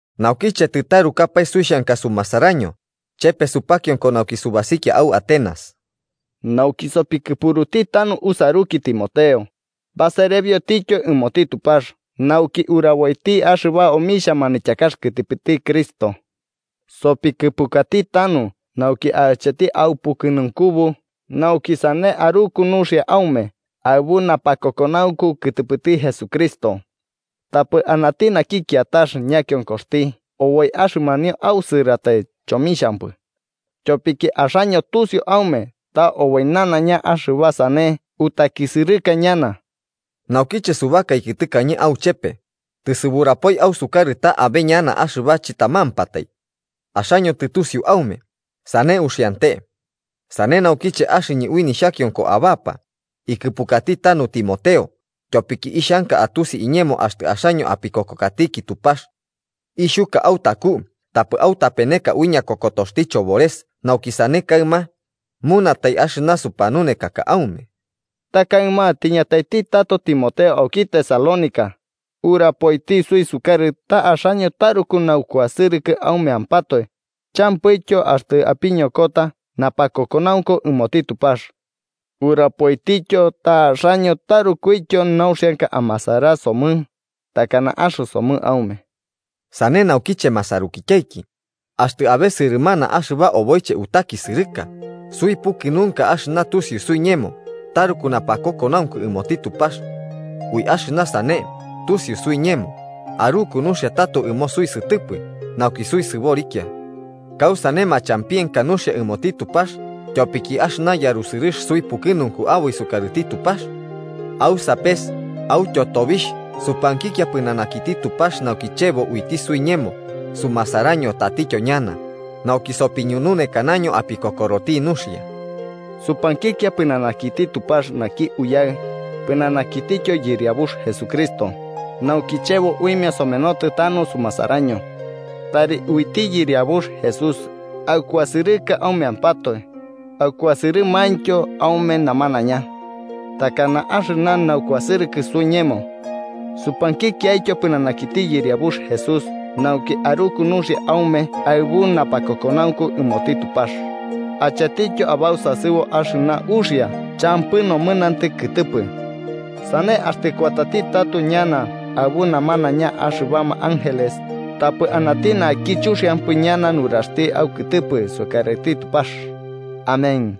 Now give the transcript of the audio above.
Naukiche, tɨtarukapae suixhanka sumasaraño, chepe supakionko nauki subasikia au Atenas nauki sopikɨpuruti tanu usaruki Timoteo, baserebiotityo ɨmoti Tupax nauki uraboiti axɨba omixhia manityakax kɨtɨpɨti Cristo. Sopikɨpukati tanu nauki acheti aupukɨnunkubu nauki sane aruku nuxia aume aɨbu napakokonaunku kɨtɨpɨti Jesucristo. Tapɨ anati naki kiatax ñakionkoxti oboi axɨmanio ausɨratai chomixhampɨ. Tyopiki axaño tusiu aume ta oboi nanaiña axɨba sane utakisɨrɨka ñana. Naukiche subakaiki tɨkañe auchepe, tɨsuburapoi ausukarɨ ta abe ñana axɨba chɨtamampatai. Axaño tɨtusiu aume, sane uxiante. Sane naukiche, axɨñɨ ui nixhakionko abapa, ikɨpukati tanu Timoteo, tyopiki ixhanka atusi iñemo axtɨ axaño apikokokatiki Tupax. Ixhuka autaku tapɨ autapeneka ui ñakokotoxti chobores nauki sane kaɨma munatai axɨna supanunekaka aume. Ta kaɨma tiñataiti tato Timoteo auki Tesalónica, urapoiti suisukarɨ ta axaño taruku naukuasɨrɨkɨ aumeampatoe, champɨityo axtɨ apiñokota napakokonaunku ɨmoti Tupax. Urapoitityo ta axaño tarukuityo nauxianka amasara somɨ takana axɨsomɨ aume. Sane naukiche masarukityaiki, axtɨ abe sɨrɨmana axɨba oboiche utakisɨrɨka, suipukɨnunka axɨna tusiu suiñemo taruku napakokonaunku ɨmoti Tupax. Ui axɨna sane tusiu suiñemo, aruku nuxia tato ɨmo suisɨtɨpɨ nauki suisɨborikia. ¿Kausane machampienka nuxia ɨmoti Tupax tyopiki axɨna yarusɨrɨx suipukɨnunku aboi sukarɨti Tupax? Au sapes autyo tobixh supankikia pɨnanakiti Tupax nauki chebo uiti suiñemo sumasaraño tatityo ñana, nauki sopiñununekanaño apikokoroti nuxia. Supankikia pɨnanakiti Tupax naki Uyaɨ, pɨnanakitityo Yɨriabux Jesucristo, nauki chebo uimia somenotɨ tanu sumasaraño. Tari uiti Yɨriabux Jesús aukuasɨrɨka aumeampatoe, akuasɨrɨmaintyo aume namanaiña. Takana axɨna naukuasɨrɨkɨ suiñemo. Supankikiaityo pɨnanakiti Yɨriabux Jesús nauki aruku nuxia aume aɨbu napakokonaunku ɨmoti Tupax, achetityo abausasɨbo axɨna uxia champɨ nomɨnantɨ kɨtɨpɨ. Sane axtɨ kuatati tato ñana aɨbu namanaiña axɨbama Ángeles, tapɨ anati naki chuxiampɨ ñana nuraxti aukɨtɨpɨ sukarɨti Tupax. Amén.